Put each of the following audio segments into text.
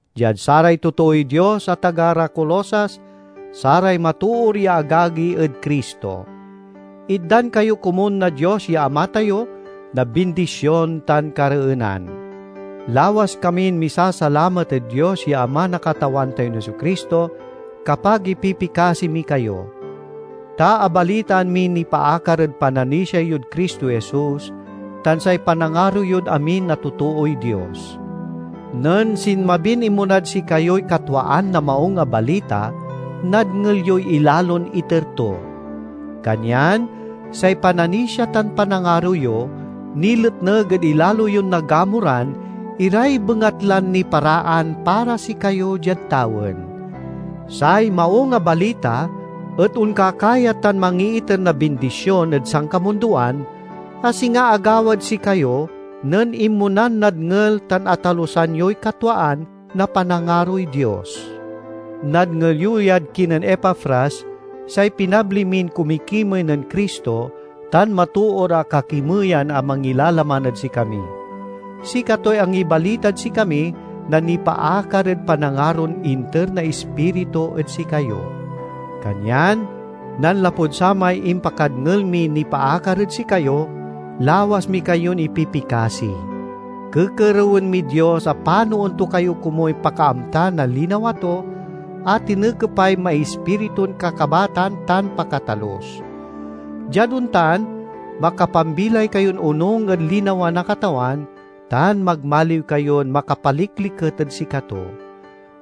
Diad saray totooy Dios a taga ra Colosas, saray matoor ya agagi ed Cristo: Itdan kayo komun na Dios ya Ama tayo na bindision tan kareenan. Lawas kamin misasalamat ed Dios ya Ama na Katawan tayon Jesu-Cristo, kapag ipipikasi mi kayo. Ta abalitaan miy nipaakar ed pananisia yod Cristo Jesus, tan say panangaro yod amin a totooy Dios. Nen sinmabin inmonad sikayoy katwaan na Maung a Balita, nadngel yoy ilalon iter to. Kanyan say pananisia tan panangaro yo niletneg ed ilalo yon nagamuran iray bengatlan niparaan para sikayo diad tawen. Say Maung a Balita et onkakayat tan mangiiter na bindision ed sankamundoan, a singa agawad sikayo nen inmonan nadngel tan atalusan yoy katwaan na panangaroy Dios. Nadngel yo yad kinen Epafras, say pinabli min kumikimey nen Cristo tan matoor a kakimeyan a mangilalaman ed sikami. Sikatoy angibalitad sikami na nipaakar ed panangaron inter na Ispiritu ed sikayo. Kanyan nanlapud samay impakadngel miy nipaakar ed sikayo, lawas mi kayon ipipikasi. Kekerewen mid Dios a panoen to kayo komuy pakaamta na linawa to, a tinekepay maispiritun kakabatan tan pakatalus. Diad ontan, makapambilay kayon onung ed linawa na Katawan, tan magmaliw kayon makapalikliket ed sikato.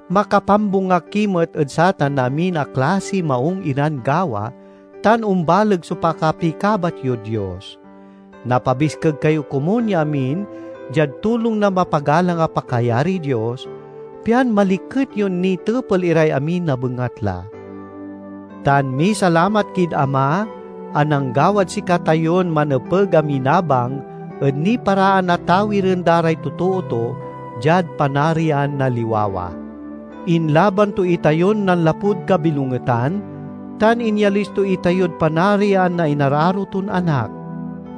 Makapambunga ki met ed satan na amin a klasiy maung iran gawa, tan ombaleg so pakapikabat yod Dios. Napabiskeg kayo komun ya amin diad tulong na mapagalang a pakayariy Dios, pian maliket yon nitepel iray amin a bengatla. Tan misalamat kid Ama a nanggawad sikatayon manepeg a minabang ed niparaan a tawiren da ray totoo to diad panarian na liwawa. Inlaban to itayon nanlapud kabilongetan tan inyalis to itayod panarian na inararo ton Anak.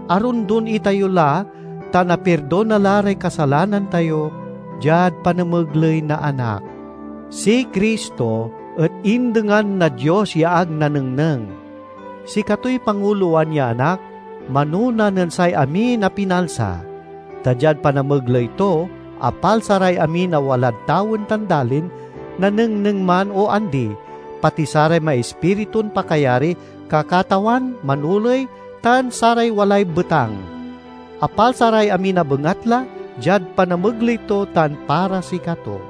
Arondon itayo la tan apirdona la ray kasalanan tayo diad panamegley na Anak. Si Cristo et indengan na Dios ya ag nanengneng. Sikatoy pangulowan ya Anak, manona nen say amin a pinalsa. Ta diad panamegley to, apalsa ray amin a walad tawen tan dalin, nanengneng man o andi, pati saray maispiritun pakayari, kakatawan, manoley, tan saray walay betang. Apalsa ray amin a bengatla diad panamegley to tan para sikato.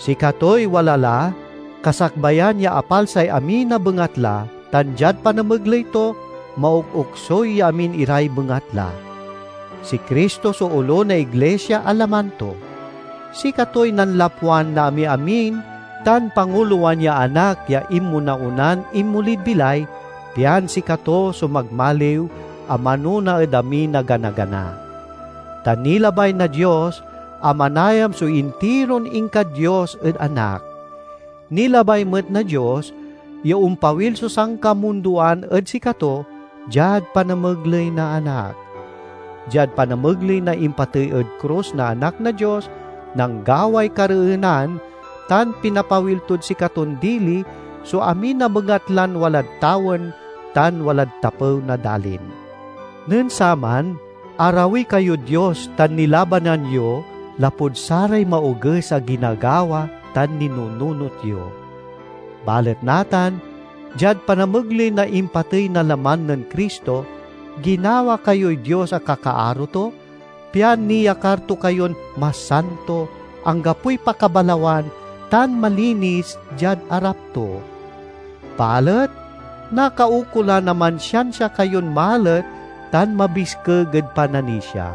Sikatoy wala la kasakbayan ya apalsay amin a bengatla tan diad panamegley to, maokoksuy ya amin iray bengatla. Si Cristo so olo na iglisia a laman to. Sikatoy nanlapwan na amiamin tan pangulowan ya Anak ya inmona-onan inmolid bilay, pian sikato so magmaliw a manona ed amin a ganagana. Ta nilabay na Dios a manayam so intiron inka-Dios ed Anak. Nilabay met na Dios ya ompawil so sankamundoan ed sikato diad panamegley na Anak. Diad panamegley na impatey ed krus na Anak na Dios, nanggaway kareenan tan pinapawil tod sikaton dili so amin a bengatlan walad tawen tan walad tapew na dalin. Nen saman, arawi kayod Dios tan nilabanan yo lapud saray maoges a ginagawa tan ninununot yo. Balet natan diad panamegley na impatey na laman nen Cristo, ginawa kayoy Dios a kakaaro to, pian niyakar to kayon masanto, anggapoy pakabalawan, tan malinis, diad arap to. Balet nakaukolan a mansiansia kayon malet tan mabiskeg ed pananisia.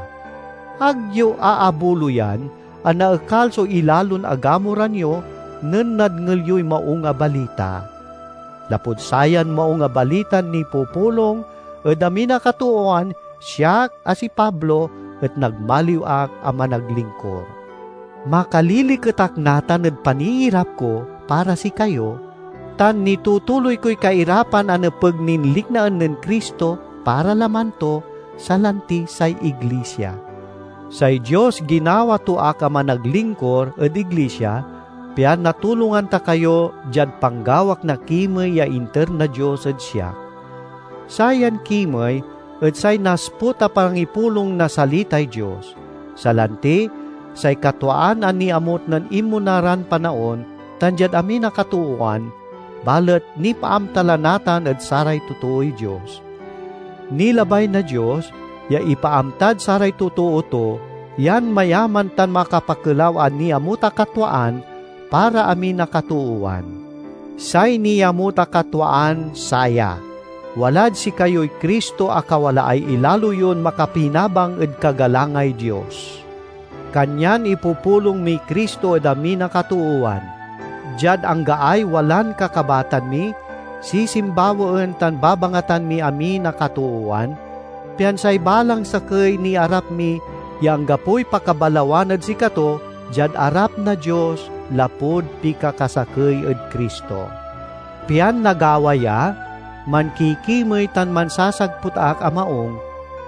Ag yo aabuloyan a naekal so ilalon agamuran yo nen nadngel yoy Maung a Balita. Lapud sayan Maung a Balitan nipupulong ed amin a katoowan, siak, a si Pablo, et nagmaliw ak a managlingkur. Makaliliket ak natan ed paniirap ko para sikayo, tan nitutuloy koy kairapan a nepeg nin liknaen nen Cristo para laman to, salanti say iglisia. Say Dios ginawa to ak a managlingkur ed iglisia, pian natulongan ta kayo diad panggawak na kimey ya inter na Dios ed siak. Sayan kimey et say nasput a pangipulong na salitay Dios, salanti say katwaan a niamut nen inmona ran panaon tan diad amin a katoowan, balet nipaamta la natan ed saray totooy Dios. Nilabay na Dios ya ipaamtad saray totoo to yan mayaman tan makapakelaw a niamut a katwaan para amin a katoowan. Say niamut a katwaan saya: walad sikayoy Cristo a kawalaay ilalo yon makapinabang ed kagalangay Dios. Kanyan ipupulong miy Cristo ed amin a katoowan. Diad anggaay walan kakabatan mi, sisimbawaen tan babangatan miy amin a katoowan, pian say balang sakey niarap mi ya anggapoy pakabalawan ed sikato diad arap na Dios, lapud pikakasakey ed Cristo. Pian nagawa ya, mankikimey tan mansasagput ak a maung,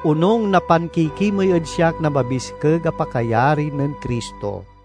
onung na pankikimey ed siak na mabiskeg a pakayari nen Cristo.